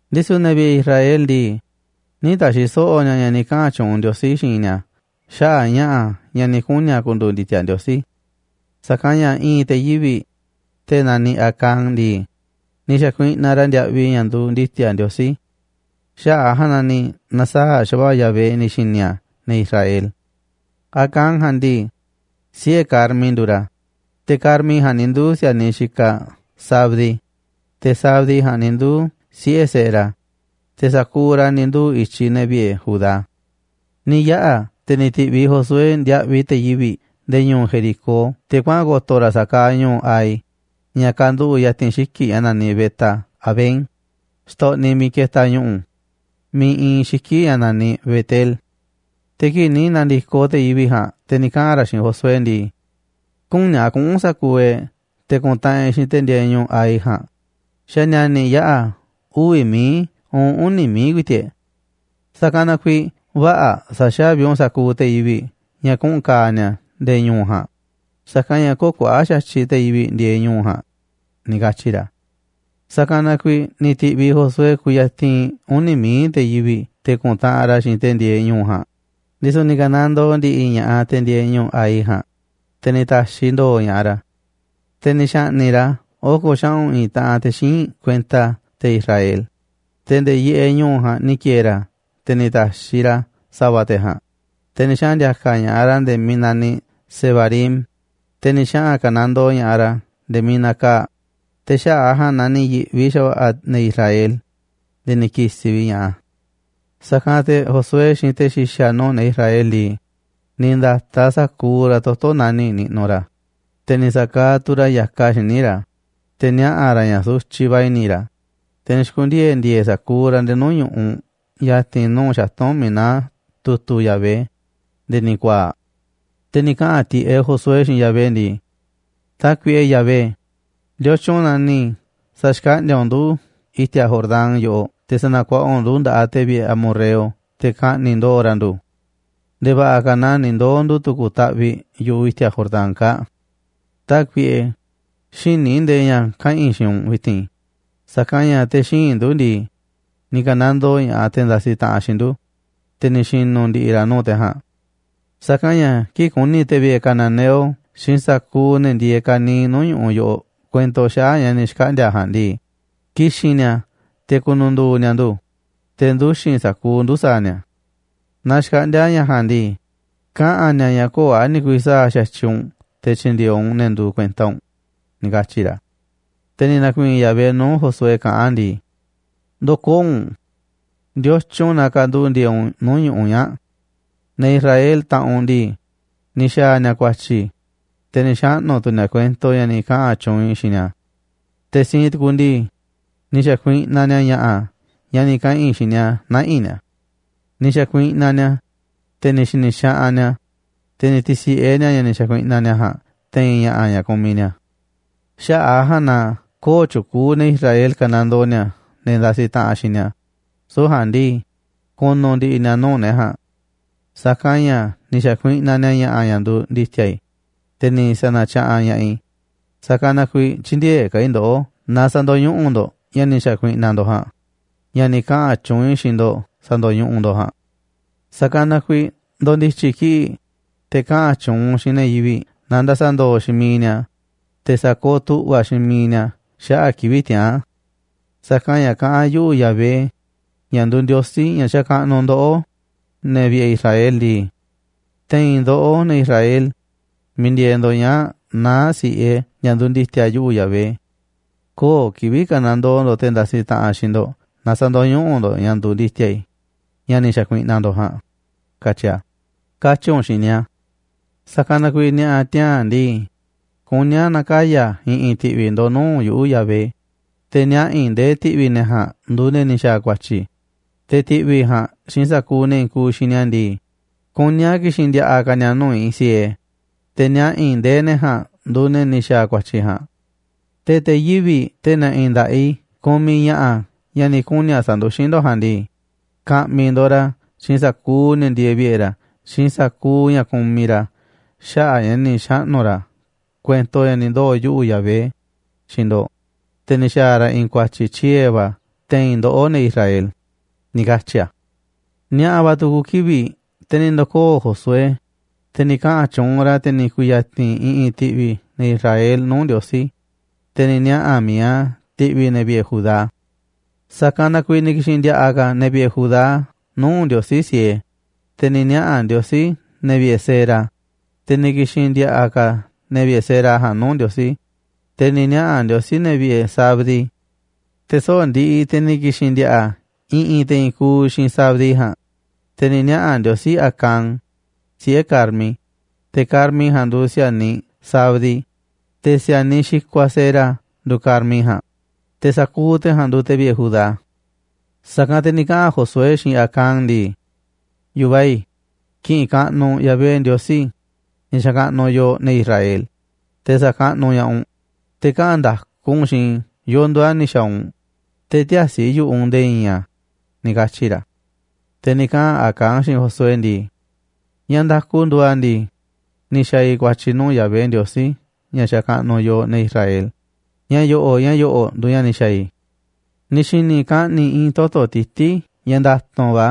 Ndisu̱ ne̱ vi̱ꞌe̱ Israel ndii, nï̱ ta̱xi̱ so̱ꞌo̱ ni̱a̱ ña̱ ni̱ kaꞌa̱n tyuunꞌ Ndiosí xiinꞌ ni̱a̱ xaꞌa̱ꞌ ña̱ꞌa̱ ña̱ ni̱ kuni̱ a̱ ku̱ndu̱u̱ ndi̱ti̱a̱ Ndiosí. Sa̱kanꞌ ña̱ i̱i̱n te̱ yivi̱ꞌ, te̱ naniꞌ Acán ndii, ni̱ xa̱kuiꞌnaꞌ ra̱ ndiaꞌviꞌ ña̱ nduuꞌ ndi̱ti̱a̱ Ndiosí. Xaꞌa̱ꞌ a̱ ja̱a̱nꞌ na ni̱ na̱saa̱ꞌ xa̱va̱ꞌa̱ Yahvé ni̱ xi̱ni̱ a̱ ne̱ Israel. Acán ja̱a̱nꞌ ndii, siꞌe̱ Carmi nduuꞌ ra̱, te̱ Carmi ja̱a̱nꞌ ni̱ nduu̱ si̱a̱niꞌ Zabdi, te̱ Zabdi ja̱a̱nꞌ ni̱ nduu̱ siꞌe̱ Zera, te̱ sa̱kuuꞌ ra̱ ni̱ nduu̱ i̱tyiꞌ ne̱ vi̱ꞌe̱ Judá. Ni̱ yaꞌa̱, te̱ ni̱ ti̱ꞌviꞌ Josué ndiaꞌviꞌ te̱ yivi̱ꞌ nde̱e̱ ñu̱u̱ Jericó te̱ kuaꞌa̱n ko̱to̱ ra̱ sa̱a̱ kaaꞌ ñu̱u̱ Hai ña̱ kanduꞌu̱ꞌ ya̱ti̱n xiki̱ꞌ ña̱ naniꞌ Bet-avén, xtoꞌniꞌ miiꞌ ketaꞌ ñu̱ꞌu̱ miiꞌ iinꞌ xiki̱ꞌ ña̱ naniꞌ Bet-el. Te̱ kii̱ꞌ ni̱ na̱ndi̱koꞌ te̱ yivi̱ꞌ ja̱a̱nꞌ te̱ ni̱ kaꞌa̱n ra̱ xiinꞌ Josué ndii: ―Küní a̱ kuꞌu̱n sa̱kuuꞌ e̱ꞌ te̱ ku̱ntaꞌanꞌ e̱ꞌ xiinꞌ te̱ ndieeꞌ ñu̱u̱ Hai ja̱a̱nꞌ, xa̱ ni̱a̱ni̱ yaꞌa̱ uvi̱ mií uun uni̱ mií ku̱i̱ti̱ꞌ e̱ꞌ. Sa̱kanꞌ na kuiiꞌ vä̱ꞌa̱ sa̱xa̱vi u̱nꞌ sa̱kuuꞌ ne̱ yivi̱ꞌ ña̱ kuꞌu̱n ka̱a̱ ni̱a̱ nde̱e̱ ñu̱u̱ ja̱a̱nꞌ, sa̱kanꞌ ña̱ köo̱ꞌ kuaꞌa̱ꞌ xa̱tyiꞌ te̱ yivi̱ꞌ ndieeꞌ ñu̱u̱ ja̱a̱nꞌ ―ni̱ katyi̱ ra̱. Sa̱kanꞌ na kuiiꞌ ni̱ ti̱ꞌviꞌ Josué kuyatinꞌ uni̱ mií te̱ yivi̱ꞌ te̱ ku̱ntaꞌanꞌ ra̱ xiinꞌ te̱ ndieeꞌ ñu̱u̱ ja̱a̱nꞌ, ndisu̱ ni̱ ka̱nandoo ndi̱ꞌi̱ ña̱ꞌaꞌ te̱ ndieeꞌ ñu̱u̱ Hai ja̱a̱nꞌ, te̱ ni̱ ta̱xiꞌ ndo̱o̱ ña̱ꞌaꞌ ra̱. Te̱ ni̱ xa̱ꞌni̱ꞌ ra̱ oko̱ xaꞌu̱n i̱i̱n taꞌan te̱ xíinꞌ kuenta te̱ Israel, te̱ nde̱e̱ yiꞌeꞌ ñu̱u̱ ja̱a̱nꞌ ni̱ ki̱e̱e̱ ra̱, te̱ ni̱ ta̱xiꞌ ra̱ sa̱va̱ te̱ ja̱a̱nꞌ, te̱ ni̱ xaꞌa̱n ndi̱a̱ka̱ ña̱ꞌaꞌ ra̱ nde̱e̱ miiꞌ naniꞌ Sebarim, te̱ ni̱ xaꞌa̱n ka̱nandoo ña̱ꞌaꞌ ra̱ nde̱e̱ miiꞌ nakaa̱ꞌ. Te̱ xaꞌa̱ꞌ a̱ ja̱a̱nꞌ na ni̱ yi̱ꞌvi xa̱va̱ꞌa̱ ne̱ Israel nde̱e̱ ni̱ ki̱si̱ vi̱ꞌ ña̱ꞌaꞌ a̱. Sa̱kanꞌ te̱ Josué xiinꞌ te̱ xi̱xa̱ nuu̱ꞌ ne̱ Israel ndii, ni̱ nda̱taꞌ sa̱kuuꞌ ra̱ toto̱ nani̱ꞌ niꞌnuꞌ ra̱, te̱ ni̱ sa̱kaaꞌ tu̱ ra̱ ya̱kaꞌ xíniꞌ ra̱ te̱ niaꞌa̱ ra̱ ña̱ sutyiꞌ va̱ i̱ni̱ ra̱. Te̱ ni̱ xi̱ku̱ndiee̱ ndi̱e̱e̱ sa̱kuuꞌ ra̱ nde̱e̱ nuu̱ꞌ ñu̱ꞌuꞌ ya̱ti̱n nuu̱ꞌ xatu̱nꞌ miiꞌ naá tu̱tu̱ Yahvé, nde̱e̱ ni̱ ku̱a̱a̱ꞌ. Te̱ ni̱ kaꞌa̱n tiꞌeꞌ Josué xiinꞌ Yahvé ndii: ―Tákuiꞌe Yahvé, ¿ndiotyun na ni̱ sa̱xkaꞌndi̱a̱ u̱nꞌ ndu̱ i̱ti̱a̱ Jordán yoꞌoꞌ te̱ sa̱na̱kuaꞌa u̱nꞌ ndu̱ nda̱ꞌaꞌ te̱ vi̱ꞌe̱ amorreo te̱ ka̱ꞌni̱ꞌ ndo̱o̱ ra̱ ndu̱? Nde̱e̱ va̱ꞌa̱ ka̱ naaꞌ ni̱ ndoo̱ ndu̱ tu̱ku̱ taꞌviꞌ yu̱ꞌuꞌ i̱ti̱a̱ Jordán kaa̱ꞌ. Tákuiꞌe, xïní i̱ ndee ña̱ kaꞌa̱n i̱ xiinꞌ u̱nꞌ vi̱ti̱n, sa̱kanꞌ ña̱ te̱ xíinꞌ ndu̱ ndii, ni̱ ka̱nandoo ña̱ꞌaꞌ te̱ ndasiꞌ taꞌanꞌ xiinꞌ ndu̱, te̱ ni̱ xi̱nu̱ ndi̱ꞌi̱ ra̱ nuu̱ꞌ te̱ ja̱a̱nꞌ. Sa̱kanꞌ ña̱ kii̱ꞌ ku̱ni̱ ne̱ vi̱ꞌe̱ cananeo xiinꞌ sa̱kuuꞌ ne̱ ndieeꞌ ka̱niiꞌ nuu̱ꞌ ñu̱ꞌuꞌ yoꞌoꞌ kuento xaꞌa̱ꞌ ña̱ ni̱ xkaꞌndi̱a̱ ja̱a̱nꞌ ndii, ki̱xi̱n ni̱a̱ te̱ ku̱nu̱ndu̱u̱ ni̱a̱ ndu̱, te̱ nduxi̱n sa̱kuuꞌ ndu̱ sa̱a̱ ni̱a̱. Naaꞌ xkaꞌndi̱a̱ ña̱ ja̱a̱nꞌ ndii, kaꞌa̱n ni̱a̱ ña̱ köo̱ꞌ a̱ ni̱ ku̱vi̱ sa̱a̱ xa̱tyiꞌ u̱nꞌ te̱ tyi̱ndi̱e̱eꞌ u̱nꞌ ne̱ nduuꞌ kuenta u̱nꞌ ―ni̱ katyi̱ ra̱. Te̱ ni̱ na̱ku̱i̱i̱n Yahvé nuu̱ꞌ Josué kaꞌán a̱ ndii: ―Ndo̱koo̱ u̱nꞌ. ¿Ndiotyun na kanduꞌu̱ꞌ ndieeꞌ u̱nꞌ nuu̱ꞌ ñu̱ꞌuꞌ ñaa̱ꞌ? Ne̱ Israel, taꞌanꞌ u̱nꞌ ndii, ni̱ xa̱a̱ ni̱a̱ ku̱a̱tyi̱, te̱ ni̱ xaꞌnu̱ tu̱ ni̱a̱ kuento ña̱ ni̱ kaꞌa̱n tyuunꞌ i̱ xiinꞌ ni̱a̱. Te̱ siinꞌ tukuꞌ ndii, ni̱ xa̱kuiꞌnaꞌ ni̱a̱ ña̱ꞌa̱ ña̱ ni̱ kaꞌa̱n i̱ xiinꞌ ni̱a̱ nä̱ꞌi̱ ni̱a̱. Ni̱ xa̱kuiꞌnaꞌ ni̱a̱, te̱ ni̱ xi̱ni̱ xaꞌanꞌ ni̱a̱, te̱ ni̱ ti̱si̱ꞌe ni̱a̱ ña̱ ni̱ xa̱kuiꞌnaꞌ ni̱a̱ ja̱a̱nꞌ te̱i̱n ña̱ꞌa̱ ña̱ kumiꞌ ni̱a̱. Xaꞌa̱ꞌ a̱ ja̱a̱nꞌ na köo̱ꞌ tyukuuꞌ ne̱ Israel ka̱nandoo ni̱a̱ ne̱ ndasiꞌ taꞌanꞌ xiinꞌ ni̱a̱, süu̱ꞌ ja̱a̱nꞌ ndii, ku̱nu̱ ndi̱ꞌi̱ ni̱a̱ nuu̱ꞌ ne̱ ja̱a̱nꞌ. Sa̱kanꞌ ña̱ ni̱ xa̱kuiꞌnaꞌ ni̱a̱ ña̱ꞌa̱ ña̱ nduuꞌ ndi̱ti̱a̱ i̱, te̱ ni̱ sa̱na̱tyaꞌanꞌ ña̱ꞌaꞌ i̱, sa̱kanꞌ na kuiiꞌ tyï̱ndi̱e̱eꞌ ka̱ i̱ ndoꞌó naaꞌ sä̱ndo̱ñuꞌuꞌ ndo̱ꞌ ña̱ ni̱ xa̱kuiꞌnaꞌ ndo̱ꞌ ja̱a̱nꞌ, ña̱ ni̱ kaꞌa̱n tyuunꞌ i̱ xiinꞌ ndo̱ꞌ sa̱ndo̱ñuꞌuꞌ ndo̱ꞌ ja̱a̱nꞌ. Sa̱kanꞌ na kuiiꞌ ndo̱ndi̱tyi̱ kii̱ꞌ, te̱ kaꞌa̱n tyuunꞌ u̱nꞌ xiinꞌ ne̱ yivi̱ꞌ na nda̱sa̱ ndo̱o̱ xiinꞌ miiꞌ ni̱a̱, te̱ sa̱kooꞌ tu̱ꞌva̱ xiinꞌ miiꞌ ni̱a̱ xaꞌa̱ꞌ kivi̱ꞌ tiaa̱n. Sa̱kanꞌ ña̱ kaꞌán yuꞌu̱, Yahvé, ña̱ nduuꞌ Ndiosí ña̱ xakaꞌnuꞌ ndoꞌó, ne̱ vi̱ꞌe̱ I̱srael ndii: “Te̱i̱n ndoꞌó, ne̱ Israel, miiꞌ ndieeꞌ ndo̱ꞌ ñaa̱ꞌ naá si̱ꞌe ña̱ nduuꞌ ndi̱ti̱a̱ yuꞌu̱, Yahvé. Köo̱ꞌ kivi̱ꞌ ka̱nandoo ndo̱ꞌ te̱ ndasiꞌ taꞌanꞌ xiinꞌ ndo̱ꞌ naaꞌ sä̱ndo̱ñuꞌuꞌ ndo̱ꞌ ña̱ nduuꞌ ndi̱ti̱a̱ i̱, ña̱ ni̱ xa̱kuiꞌnaꞌ ndo̱ꞌ ja̱a̱nꞌ”, katyi̱ a̱, katyi̱ u̱nꞌ xiinꞌ ni̱a̱. Sa̱kanꞌ na kuiiꞌ ni̱a̱ꞌa̱ tiaa̱n ndii, kuní a̱ na̱kaya̱ i̱ꞌi̱n ti̱ꞌvi̱ ndo̱ꞌ nuu̱ꞌ yuꞌu̱, Yahvé, te̱ niaꞌa̱ i̱ ndee ti̱ꞌvi̱ ja̱a̱nꞌ nduuꞌ ne̱ ni̱ xa̱a̱ ku̱a̱tyi̱, te̱ ti̱ꞌvi̱ ja̱a̱nꞌ xiinꞌ sa̱kuuꞌ ne̱ i̱i̱n kuuꞌ xiinꞌ ni̱a̱ ndii, kuní a̱ ki̱xi̱n ndi̱a̱ꞌa̱ ka̱ ni̱a̱ nuu̱ꞌ i̱ siee, te̱ niaꞌa̱ i̱ ndee ne̱ ja̱a̱nꞌ nduuꞌ ne̱ ni̱ xa̱a̱ ku̱a̱tyi̱ ja̱a̱nꞌ. Te̱ te̱ yivi̱ꞌ, te̱ na̱ꞌi̱ nda̱ꞌaꞌ i̱ kumiꞌ ña̱ꞌa̱ ña̱ ni̱ kuni̱ a̱ sa̱nduxín ndo̱ꞌ ja̱a̱nꞌ ndii, ka̱ꞌmi̱ ndo̱ꞌ ra̱ xiinꞌ sa̱kuuꞌ ne̱ ndieeꞌ vi̱ꞌe̱ ra̱ xiinꞌ sa̱kuuꞌ ña̱ kumiꞌ ra̱ xaꞌa̱ꞌ a̱ ña̱ ni̱ xaꞌnu̱ ra̱ kuento ña̱ ni̱ ndoo̱ yuꞌu̱, Yahvé, xiinꞌ ndo̱ꞌ, te̱ ni̱ xa̱a̱ ra̱ i̱i̱n ku̱a̱tyi̱ tyiee̱ va̱ te̱i̱n ndoꞌó, ne̱ Israel ―ni̱ katyi̱ a̱. Ni̱a̱ꞌa̱ va̱ tu̱ku̱ kivi̱ꞌ te̱ ni̱ ndo̱koo̱ Josué, te̱ ni̱ kaꞌa̱n tyuunꞌ ra̱, te̱ ni̱ ku̱ya̱ti̱n i̱ꞌi̱n ti̱ꞌvi̱ ne̱ Israel nuu̱ꞌ Ndiosí, te̱ ni̱ niaꞌa̱ mi̱iꞌ a̱ ti̱ꞌvi̱ ne̱ vi̱ꞌe̱ Judá. Sa̱kanꞌ na ni̱ ki̱xi̱n ndi̱a̱ꞌa̱ ka̱ ne̱ vi̱ꞌe̱ Judá nuu̱ꞌ Ndiosí siee, te̱ ni̱ niaꞌa̱ Ndiosí ne̱ vi̱ꞌe̱ Zera, te̱ ni̱ ki̱xi̱n ndi̱a̱ꞌa̱ ka̱ ne̱ vi̱ꞌe̱ Zera ja̱a̱nꞌ nuu̱ꞌ Ndiosí, te̱ ni̱ niaꞌa̱ Ndiosí ne̱ vi̱ꞌe̱ Zabdi. Te̱ soꞌo̱ꞌ ndiꞌiꞌ te̱ ni̱ ki̱xi̱n ndi̱a̱ꞌa̱ i̱ꞌi̱n te̱ i̱i̱n kuuꞌ xiinꞌ Zabdi ja̱a̱nꞌ, te̱ ni̱ niaꞌa̱ Ndiosí Acán, siꞌe̱ Carmi, te̱ Carmi ja̱a̱nꞌ nduuꞌ si̱a̱niꞌ Zabdi, te̱ si̱a̱niꞌ xikuaꞌ Zera nduuꞌ Carmi ja̱a̱nꞌ, te̱ sa̱kuuꞌ te̱ ja̱a̱nꞌ nduuꞌ te̱ vi̱ꞌe̱ Judá. Sa̱kanꞌ te̱ ni̱ kaꞌa̱n Josué xiinꞌ Acán ndii: ―Yu̱vaꞌ i̱, ki̱ꞌi̱n kaꞌnuꞌ u̱nꞌ Yahvé Ndiosí, ña̱ xakaꞌnuꞌ yooꞌ, ne̱ Israel, te̱ sa̱kaꞌnuꞌ ña̱ꞌaꞌ u̱nꞌ. Te̱ kaꞌa̱n nda̱ku u̱nꞌ xiinꞌ i̱ yo̱o̱ nduuꞌ a̱ ni̱ xa̱a̱ u̱nꞌ, te̱ ti̱ä̱si̱ yu̱ꞌuꞌ u̱nꞌ nde̱e̱ i̱i̱n a̱ ―ni̱ katyi̱ ra̱. Te̱ ni̱ kaꞌa̱n Acán xiinꞌ Josué ndii: ―Ña̱ nda̱ku nduuꞌ a̱ ndii, ni̱ xa̱a̱ i̱ ku̱a̱tyi̱ nuu̱ꞌ Yahvé, Ndiosí ña̱ xakaꞌnuꞌ yooꞌ, ne̱ Israel. Ña̱ yo̱ꞌo̱ꞌ ña̱ yo̱ꞌo̱ꞌ nduuꞌ ña̱ ni̱ xa̱a̱ i̱. Ni̱ xi̱ni̱ i̱ kaꞌni̱ i̱i̱n toto̱ tití ña̱ nda̱tu̱nꞌ va̱,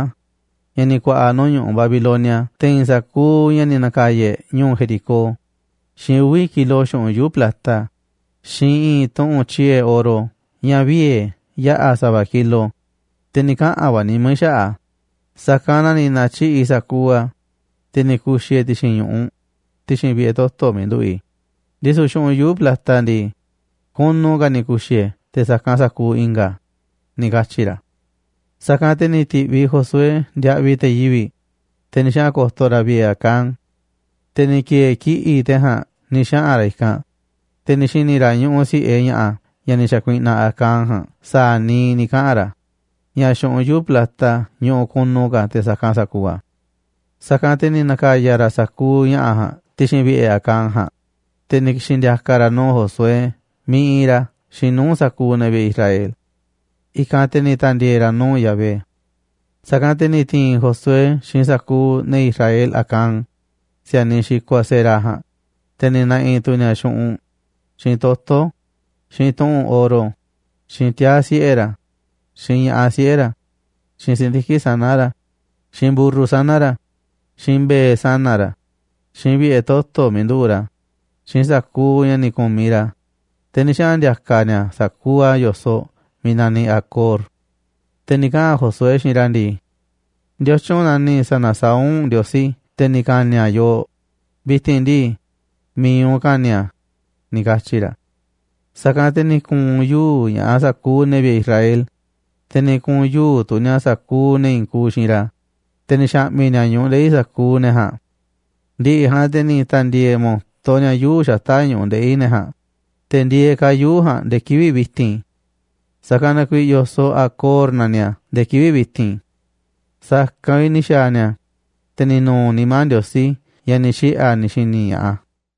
ña̱ ni̱ ku̱a̱ꞌa̱ nuu̱ꞌ ñu̱ꞌuꞌ Babilonia te̱i̱n sa̱kuuꞌ ña̱ ni̱ na̱ka̱ya̱ e̱ꞌ ñu̱u̱ Jericó, xiinꞌ uvi̱ kilo xu̱ꞌunꞌ yuu̱ꞌ plata, xiinꞌ i̱i̱n tuꞌu̱nꞌ tyiee̱ oro ña̱ viee̱ yaꞌa̱ sa̱va̱ kilo. Te̱ ni̱ kaꞌa̱n va̱ nimá i̱ xaꞌa̱ꞌ a̱, sa̱kanꞌ na ni̱ na̱tyiꞌi̱ꞌ i̱ sa̱kuuꞌ a̱, te̱ ni̱ ku̱xi̱ i̱ e̱ ti̱xi̱n ñu̱ꞌuꞌ, ti̱xi̱n vi̱ꞌe̱ toto̱ miiꞌ nduꞌu̱ꞌ i̱, ndisu̱ xu̱ꞌunꞌ yuu̱ꞌ plata ndii, kunu ka̱ ni̱ ku̱xi̱ i̱ e̱ te̱ sa̱kanꞌ sa̱kuuꞌ i̱nga̱ a̱ ―ni̱ katyi̱ ra̱. Sa̱kanꞌ te̱ ni̱ ti̱ꞌviꞌ Josué ndiaꞌviꞌ te̱ yivi̱ꞌ, te̱ ni̱ xaꞌa̱n ko̱to̱ ra̱ vi̱ꞌe̱ Acán. Te̱ ni̱ ki̱e̱e̱ kiꞌi̱ꞌ te̱ ja̱a̱nꞌ ni̱ xaꞌa̱n ra̱ i̱kanꞌ, te̱ ni̱ xi̱ni̱ ra̱ ñuꞌuꞌ si̱ꞌe ña̱ꞌa̱ ña̱ ni̱ xa̱kuiꞌnaꞌ Acán ja̱a̱nꞌ sa̱a̱ niiꞌ ni̱ kaꞌa̱n ra̱, ña̱ xu̱ꞌunꞌ plata ñuꞌuꞌ kunu ka̱ te̱ sa̱kanꞌ sa̱kuuꞌ a̱. Sa̱kanꞌ te̱ ni̱ na̱ka̱ya̱ ra̱ sa̱kuuꞌ ña̱ꞌa̱ ja̱a̱nꞌ ti̱xi̱n vi̱ꞌe̱ Acán ja̱a̱nꞌ, te̱ ni̱ ki̱xi̱n ndi̱a̱ka̱ ra̱ a̱ nuu̱ꞌ Josué miiꞌ iinꞌ ra̱ xiinꞌ nuu̱ꞌ sa̱kuuꞌ ne̱ vi̱ꞌe̱ Israel. I̱kanꞌ te̱ ni̱ ta̱ndi̱e̱e̱ ra̱ nuu̱ꞌ Yahvé. Sa̱kanꞌ te̱ ni̱ ti̱i̱n Josué xiinꞌ sa̱kuuꞌ ne̱ Israel Acán, si̱a̱niꞌ xikuaꞌ Zera ja̱a̱nꞌ, te̱ ni̱ na̱ꞌi̱ tu̱ ni̱a̱ xu̱ꞌunꞌ, xiinꞌ toto̱, xiinꞌ tuꞌu̱nꞌ oro, xiinꞌ tiaa̱ siꞌe̱ ra̱, xiinꞌ ña̱ꞌaꞌ siꞌe̱ ra̱, xiinꞌ si̱ndiki̱ꞌ sana̱ ra̱, xiinꞌ mburru sana̱ ra̱, xiinꞌ mbe̱e̱ sana̱ ra̱, xiinꞌ vi̱ꞌe̱ toto̱ miiꞌ nduꞌu̱ꞌ ra̱, xiinꞌ sa̱kuuꞌ ña̱ ni̱ ku̱miꞌ ra̱, te̱ ni̱ xaꞌa̱n ndi̱a̱ka̱ ni̱a̱ sa̱kuuꞌ a̱ yo̱soꞌ miiꞌ naniꞌ Acor. Te̱ ni̱ kaꞌa̱n Josué xiinꞌ ra̱ ndii: ―¿Ndiotyun na ni̱ sa̱na̱saá u̱nꞌ Ndiosí te̱ ni̱ ka̱ni̱ a̱ yooꞌ? Vi̱ti̱n ndii, mi̱iꞌ u̱nꞌ ka̱ni̱ a̱ ―ni̱ katyi̱ ra̱. Sa̱kanꞌ te̱ ni̱ ku̱u̱n yuu̱ꞌ ña̱ꞌaꞌ sa̱kuuꞌ ne̱ vi̱ꞌe̱ Israel, te̱ ni̱ ku̱u̱n yuu̱ꞌ tu̱ ni̱a̱ sa̱kuuꞌ ne̱ i̱i̱n kuuꞌ xiinꞌ ra̱, te̱ ni̱ xa̱ꞌmi̱ ni̱a̱ ñu̱ꞌuꞌ ndeꞌi̱ sa̱kuuꞌ ne̱ ja̱a̱nꞌ. Ndi̱ꞌi̱ ja̱a̱nꞌ te̱ ni̱ ta̱ndi̱e̱e̱ mo̱to ni̱a̱ yuu̱ꞌ xata̱ꞌ ñu̱ꞌuꞌ ndeꞌi̱ ne̱ ja̱a̱nꞌ, te̱ ndieeꞌ ka̱ yuu̱ꞌ ja̱a̱nꞌ nde̱e̱ kivi̱ꞌ vi̱ti̱n. Sa̱kanꞌ na kuiiꞌ yo̱soꞌ Acor naniꞌ a̱ nde̱e̱ kivi̱ꞌ vi̱ti̱n. Sa̱kanꞌ vi̱ꞌ ni̱ xa̱a̱ ni̱a̱, te̱ ni̱ nu̱u̱ nimá Ndiosí ña̱ ni̱ xiꞌe̱ a̱ ni̱ xi̱ni̱ ña̱ꞌaꞌ a̱.